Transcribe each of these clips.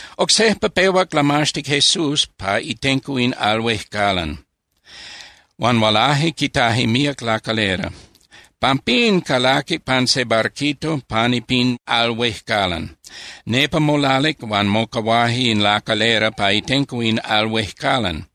Oc sejpa pehuac lamaxtic Jesús pa itenco in al huejcalan, huan hualaje quitaje míac lacalera. Pampín calaquic pan se barquito pani pin al huejcalan. Nepa molalic, huan mocahuaje in lacalera pa itenco in al huejcalan.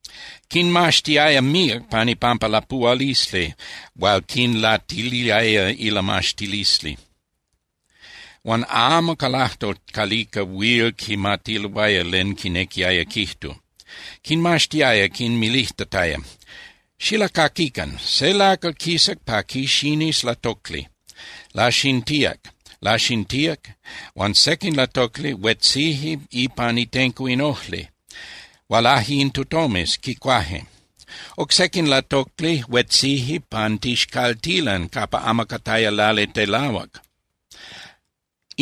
Quinmaxtiaya míac pan ipampa lapuhualisli hual quinlatiliaya ilamaxtilisli, huan amo ca lajtol calica huil quimatiloaya len quinequiaya quijtu. Quinmaxtiaya quinmilijtataya: —Xilacaquican: Se lacal quisac pa quixinis latocli. Laxintíac, laxintíac huan sequin latocli huetzije ipan itenco in ojli. Hualaje in tutomes, quicuaje. Oc sequin latocli huetzije pan tixcaltilan capa amo cataya lali telahuac.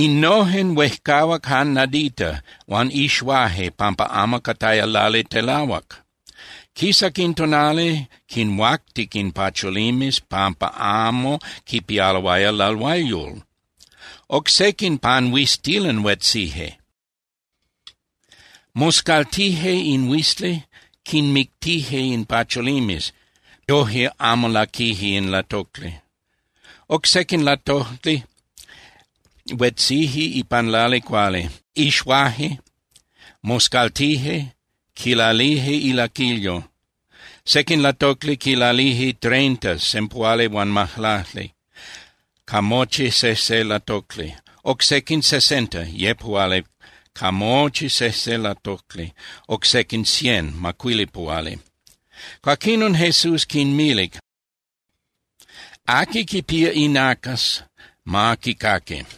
Innojen huejcahuac jan nadita huan ixuaje pampa amo cataya lali telahuac. Quisac in tonali, quinhuactic in pacholimes pampa amo quipialoaya lalhuayol. Oc sequin pan huiztilan huetzije. Moscaltije in huizli, quinmictije in pacholimes, yoje amo laquije in latocli. Oc sequin latocli huetzije ipan lali cuali. Ixuaje, moscaltije, quilalije ilaquilyo. Sequin latocli quilalije treinta (sempuhualihuanmajlacli) ca mochi sejse latocli, oc sequin sesenta (yepuhuali) ca mochi sejse latocli, oc sequin cien (macuilipuhuali). Cuaquinon Jesús quinmilic: —Aqui quipía inacas, ma quicaqui.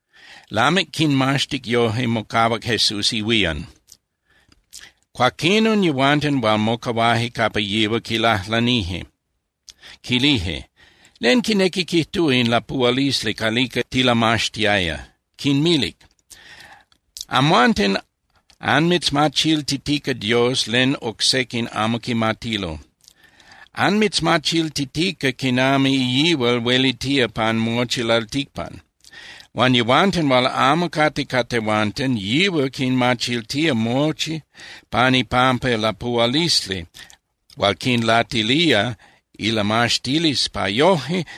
Lamic quinmaxtic yoje, mocahuac Jesús ihuían. Cuaquinon yehuanten hual mocahuaje capa yihual quilajlanije, quilije: —¿Len quinequi quijtúa in lapuhualisli calica tilamaxtiaya? Quinmilic: —Amhuanten anmitzmachiltitica Dios len oc sequin amo quimatilo. Anmitzmachiltitica quinami yihual huelitía pan mochi lalticpan. Huan yehuanten hual amo cate ca tehuanten, yihual quinmachiltía mochi pan ipampa lapuhualisli hual quinlatilía ilamaxtilisli, pa yoje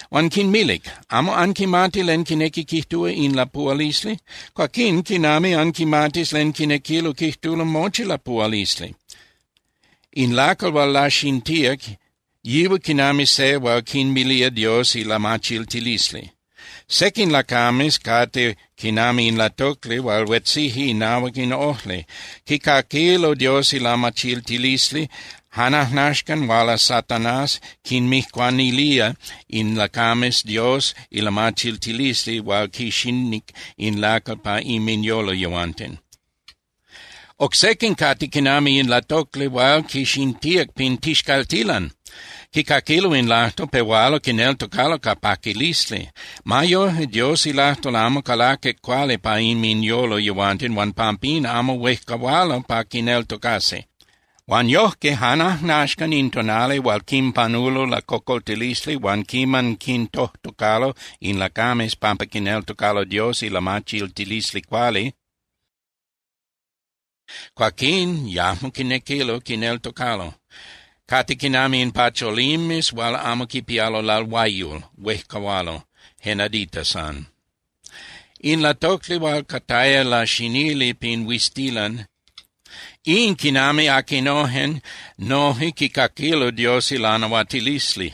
Huan quinmilic: —¿Amo anquimati len quinequi quijtúa in lapuhualisli? Cuaquín ¿quinami anquimatis len quinequilo quijtulo mochi lapuhualisli? In lacal hual laxintíac, yihual quinami se hual quinmilía Dios ilamachiltilisli. Sequin lacames cate quinami in latocli hual huetzije inahuac in ojli. Quicaquilo Dios ilamachiltilisli, jan ajnaxcan huala Satanás, quinmijcuanilía in lacames Dios ilamachiltilisli hual quixinic in lacal pa inminyolo yehuanten. Oc sequin cate quinami in latocli hual quixintíac pin tixcaltilan. Quicaquilo in lajtol, pehualo quineltocalo ca paquilisli. Ma yoje, Dios ilajtol amo calaquic cuali pa inminyolo yehuanten huan pampín amo huejcahualo pa quineltocasi. Huan yojque jan ajnaxcan in tonali hual quinpanulo lacocoltilisli huan quiman quintojtocalo in lacames pampa quineltocalo Dios ilamachiltilisli cuali, cuaquín yajmo quinequilo quineltocalo. Cate quinami in pacholimes hual amo quipialo lalhuayol, huejcahualo je nadita san. In latocli hual cataya laxinili pin huiztilan, in quinami aquinojen noje quicaquilo Dios ilanahuatilisli.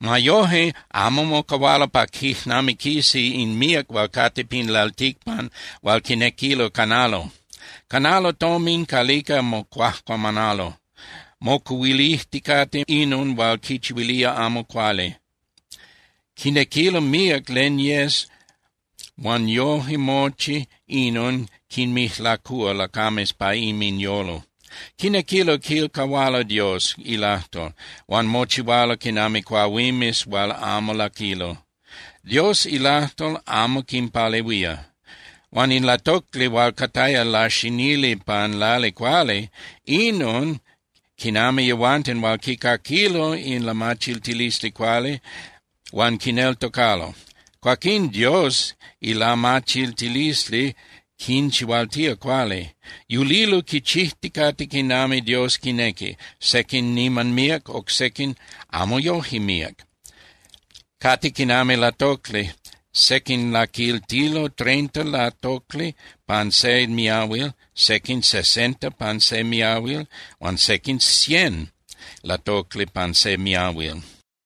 Ma yoje, amo mocahualo pa quijnamiquisi in míac hual cate pin lalticpan hual quinequilo canalo. Canalo tomin calica mocuajcuamanalo, mocuhuilijticate inon hual quinchihuilía amo cuali. Quinequilo míac len yes huan yoje mochi inon quinmijlacúa lacames pa inminyolo. Quinequilo quilcahualo Dios ilajtol, huan mochihualo quinami cuahuimes hual amo laquilo. Dios ilajtol amo quinpalehuía. Huan in latocli hual cataya laxinili pan lali cuali, inon quinami yehuanten hual quicaquilo in lamachiltilisli cuali huan quineltocalo. Cuaquinon Dios ilamachiltilisli quinchihualtía cuali. Yulilo quichijticate quinami Dios quinequi, sequin niman míac, oc sequin amo yoje míac, cate quinami latocli, sequin quilaquiltilo treinta latocli pan se miahuil, sequin sesenta pan se miahuil huan sequin cien latocli pan se miahuil.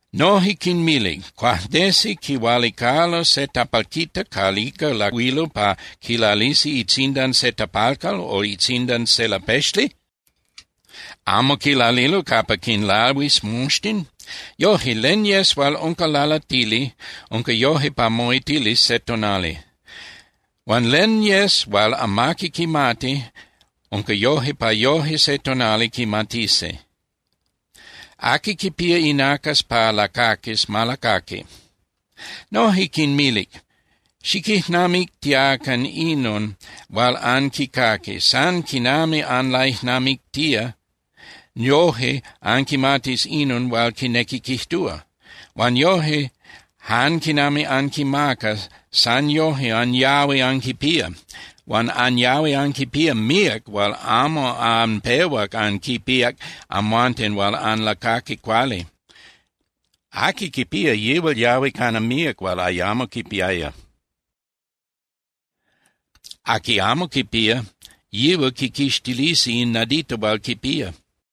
Noje quinmilic: —¿Cuajnesi quihualicalo se tapalquita calica lahuilo pa quilalisi itzindan se tapalcal o itzindan se lapexli? ¿Amo quilalilo capa quinlahuis moxtin? Yoje, len yes hual unca lalatili, unca yoje pa moitilis se tonali. Huan len yes hual amaqui quimati, unca yoje pa yoje se tonali quimatisi. Aqui quipía inacas pa lacaquis, ma lacaqui. Noje quinmilic: —Xiquijnamictiacan inon hual anquicaqui. San quinami anlaijnamictía, yoje anquimatis inon hual quinequi quijtúa. Huan yoje, jan quinami anquimaca, san yoje anyahui anquipía. Huan anyahui anquipía míac hual amo anpehuac anquipíac amhuanten hual anlacaqui cuali. Aqui quipía, yihual yahui cana míac hual ayamo quipiaya. Aqui amo quipía, yihual quiquixtilisi in nadita hual quipía.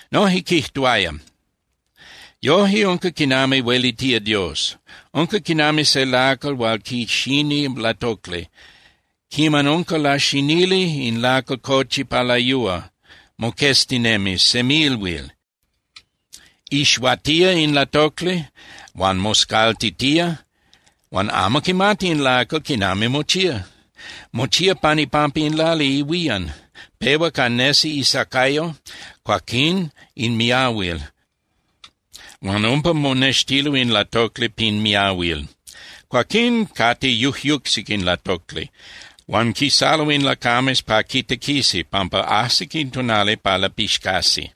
Noje quijtuaya: —Yoje unca quinami huelitía Dios. Unca quinami se lacal hual quixini latocli. Quiman unca laxinili, in lacal cochi pa layúa, moqueztinemi semilhuil. Ixuatía in latocli huan moscaltitía huan amo quimati in lacal quinami mochía. Mochía pan ipampa in lali ihuían. Pehua ca nesi isacayo, cuaquín in miahuil, huan umpa monextilo in latocli pin miahuil. Cuaquín cate yujyucsic in latocli, huan quisalo in lacames pa quitequisi, pampa ajsic in tonali pa lapixcasi.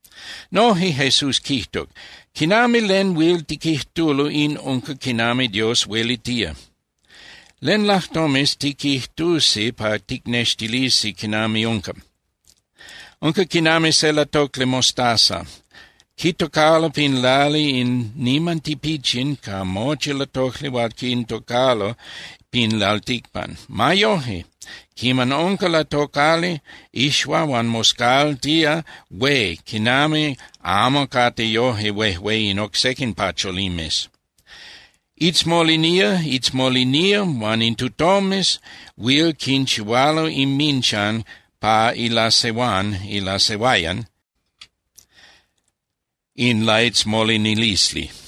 Noje Jesús quijtuc: —¿Quinami len huil tiquijtulo in unca quinami Dios huelitía? ¿Len lajtomes tiquijtusi pa ticnextilisi quinami unca? Unca quinami se latocli mostaza. Quitocalo pin lali in niman tipichin ca mochi latocli hual quitocalo pin lalticpan. Ma yoje, quiman unca latocali, ixua huan moscaltía hué quinami amo cate yoje huejué in oc sequin pacholimes. Itzmolinía, itzmolinía huan in tutomes huil quinchihualo inminchan pa ilasehuán (ilasehuayan) in laitzmolinilisli.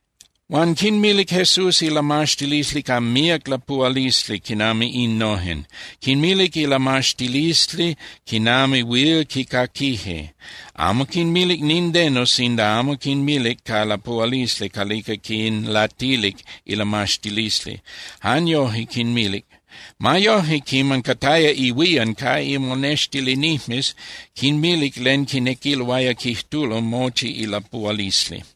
Huan quinmilic Jesús ilamaxtilisli ca míac lapuhualisli quinami innojen. Quinmilic ilamaxtilisli quinami huil quicaquije. Amo quinmilic nindeno sinda amo quinmilic ca lapuhualisli calica quinlatilic ilamaxtilisli, jan yoje quinmilic. Ma yoje quiman cataya ihuían ca imonextilinijmes, quinmilic len quinequiloaya quijtulo mochi ilapuhualisli.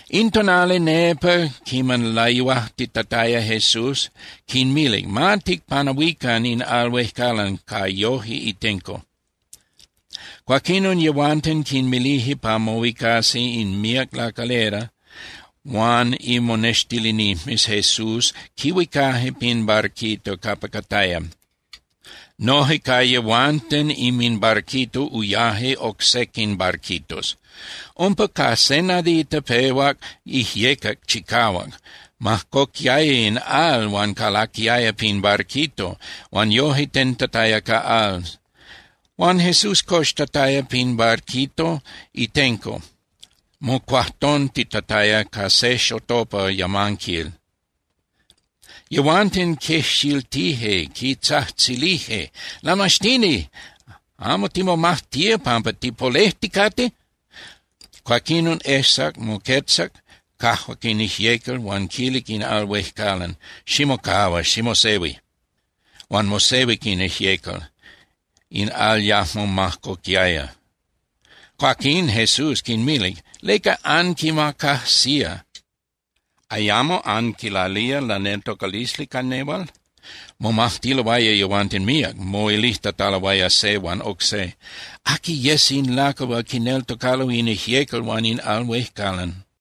In tonali nepa quiman layuajtitataya, Jesús quinmilic: —Ma ticpanahuican in al huejcalan ca yoje itenco. Cuaquinon yehuanten quinmilije pa mohuicasi in míac lacalera huan imonextilinijmes Jesús quihuicaje pin barquito capa cataya. Noje ca yehuanten inminbarquito uyaje oc sequin barquitos. Umpa ca se nadita pehuac ijyecac chicahuac. Majcoquiaya in al huan calaquiaya pin barquito, huan yoje tentataya ca al. Huan Jesús coxtataya pin barquito itenco, mocuajtontitataya ca se xotopa yamanquil. Yehuanten quejxiltije, quitzajtzilije: —¡Lamaxtini! ¿Amo timomajtía pampa tipolejticate? Cuaquinon ejsac, moquetzac, cajuac in ijyecal huan quilic in al huejcalan: —¡Ximocahua, ximosehui! Huan mosehuic in ijyecal, in al yajmo majcoquiaya. Cuaquín Jesús quinmilic: —¿Leca anquimacajsía? ¿Ayamo anquilalía laneltocalisli ca nehual? Momajtiloaya yehuanten míac, moilijtataloaya se huan oc se: —¿Aqui yes in lacal hual quineltocalo in ijyecal huan in al huejcalan?